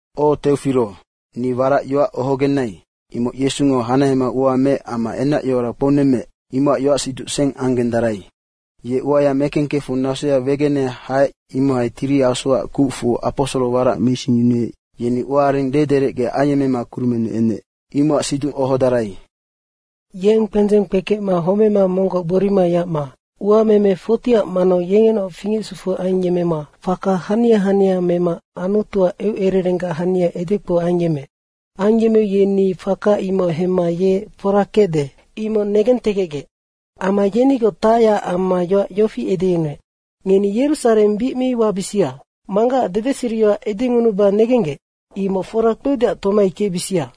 O Teofiro, ni warac yoac ohogenai, imoc Yesungo hanahema ua meec amma enacyoara kpounemmeec, imocac yoacsiduc seng anggendarai. Ye uaya mekengkefu nasoya wegene haec imohai Tiri Asuac kucfu aposoro warac meisingyunuec, yeni uaareng dederecge ayemmema kurumennu enec, imocac siducnoc ohodarai. Yeng kpendzeng kpekecma homema monggoc gborima yacma uameme 40ac manau yengenaoc fingecsufu ayemmema faka hania hania mema Anutuac eucererenggac hania edekpou ayemmeec. Ayemmeu yeni faka imoc hemma ye fora kecde, imoc negentegecgec. Amma yenigoc tacyac amma yoac yofi edeyunuec, “Ngeni Yerusareng bic mi wabisia. Manggacac dedeseriyoac edengunuba negenggec, imoc fora kpeudeac tomai kecbisia.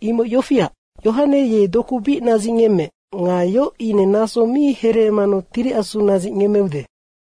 Imoc yofiac, Yohane ye doku bic nadzicngemmeec nga yoc ine naso mi hereemanu Tiri Asu nadzicngemmeude.”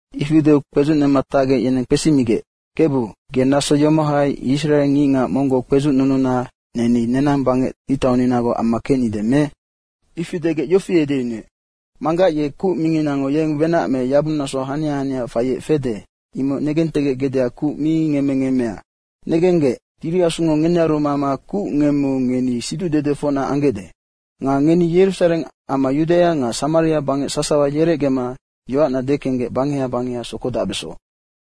Ifi deu kpedzucnema tacgec yeneng kpesimigec, “Kebu, ge naso yomohai Israe ngicngac monggoc kpedzucnununa neni nenang bangec ngictauninagoc amma kecnide me?” Ifi degec yofi edeyunuec, “Manggac ye kuc minginango yeng wenac me yabungnaso hania hania faiec fede, imoc negentegecgecdeac kuc mi ngemme ngemmea. Negenggec, Tiri Asungo ngenearu mama kuc ngemmeu ngeni siducdedefocna anggecde. Nga ngeni Yerusareng amma Yudaia nga Samaria bangec sasawa yerecgema yoacna dekenggec bangeha bangeha sokodacbeso.”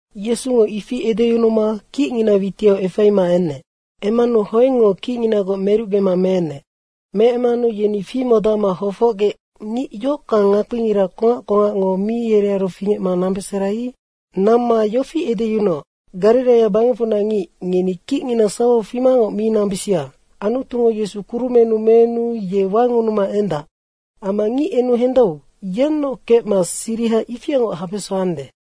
Yesungo ifi edeyunuma kicngina witiau efaima enec. Emmanu hoengngo kicnginaungoc merucgema meenec. Meemmanu yeni fimodacma hofocgec ngic yohockang ngakpingira kongac kongacngo mi yenearu fingecma nambesera i. Namma yofi edeyunuoc, “Gariraia bangecfunac ngic, ngeni kicngina sawau fimangoc mi nambisia. Anutungo Yesu kurumennu meenu ye wangunuma endac. Amma ngic enu hendau, yennoc kecma siriha ifiangoc habesande.”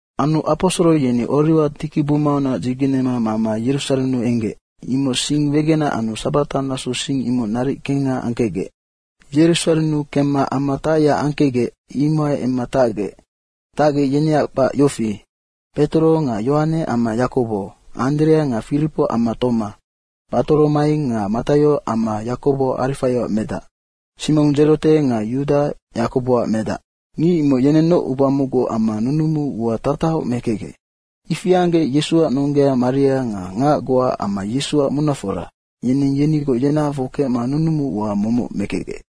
Anu aposoro yeni Oriwa tikibumaunac dzigenema mama Yerusarennu enggec, imoc sing wegenac anu sabata nasou sing imoc naric kengha angkecgec. Yerusarennu kemma ama tacyac angkecgec, imohai emma tacgec. Tacgec, yeneac kpac yofi: Petoro nga Yohane amma Yakobo, Anderea nga Firipo amma Toma, Batoromaio nga Mataio amma Yakobo Arifaioac medac, Simong Dzerote nga Yuda Yakoboac medac. Ngic imoc yenennoc uba mocgu amma nunumu ua tatahoc mekecgec. Ifi anggec Yesuac nonggea Maria nga ngac goa amma Yesuac munafora, yeneng yenigoc yenahafoc kecma nunumu ua momoc mekecgec.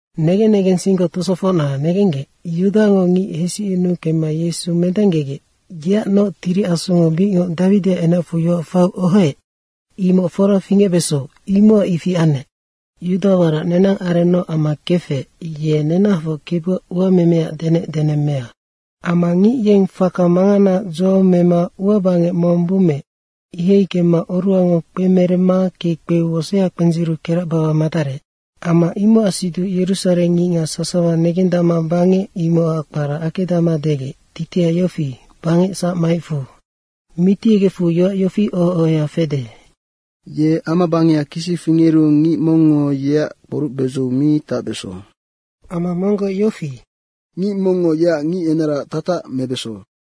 “Negen negensinggoc tosofocna, negenggec, Yudango ngic hesicyunuu kemma Yesu mendanggegec, yeacnoc Tiri Asungo bicngoc Dawidiac enacfu yoac faiu ohoec, imoc fora fingecbeso, imocac ifi anec. Yuda warac nenang arennoc amma kefec, ye nenahafoc Kebuac uamemeac denecdenemmea.” “Amma ngic yeng faka manganaac dzo mema ua bangec mong bummeec, ihai kemma oruhango kpemeremma kekpeu wosea kpendziru keracbawa madarec. Amma imocac siduc Yerusareng ngicngac sasawa negendacma bangec, imocac kpara Akedama degec, titiha yofi, ‘Bangec sac maecfu.’” “Mitiyegecfu yoac yofi oho ohoya fede, ‘Ye amabangeha kisi fingeru ngic mongngo yeac kporucbedzou mi tacbeso.’ Amma monggoc yofi, ‘Ngic mongngo yeac ngicenaraac tatac mebeso.’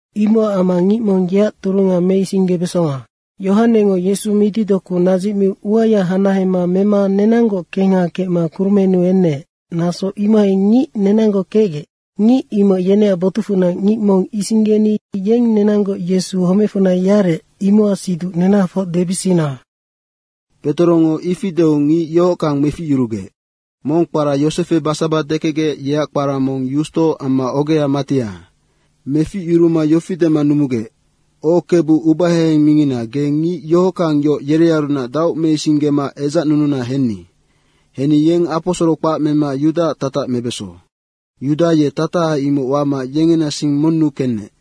Imocac amma ngic mong yeac turunga meisinggebesonga. Yohanengo Yesu mitidoku nadzicmiu uaya hanahema mema nenanggoc kengha kecma kurumennu enec, naso imohai ngic nenanggoc kecgec, ngic imoc yeneac botucfunac ngic mong isinggeni yeng nenanggoc Yesu homecfunac yarec, imocac siduc nenahafoc debisina.” Petorongo ifi deu ngic yohockang meficyurugec: Mong kpara Yosefe Basaba dekecgec, yeac kpara mong Yusto, amma ogea Matia. Meficyuruma yofi dema numugec, “O, Kebu ubaheheng mingina, ge ngic yohockang yoc yerearunac daoc meisinggema edzacnununa henni. Henni yeng aposoro kpac mema Yudaac tatac mebeso. Yuda ye tataha imoc wama yengena sing monnu kenec.”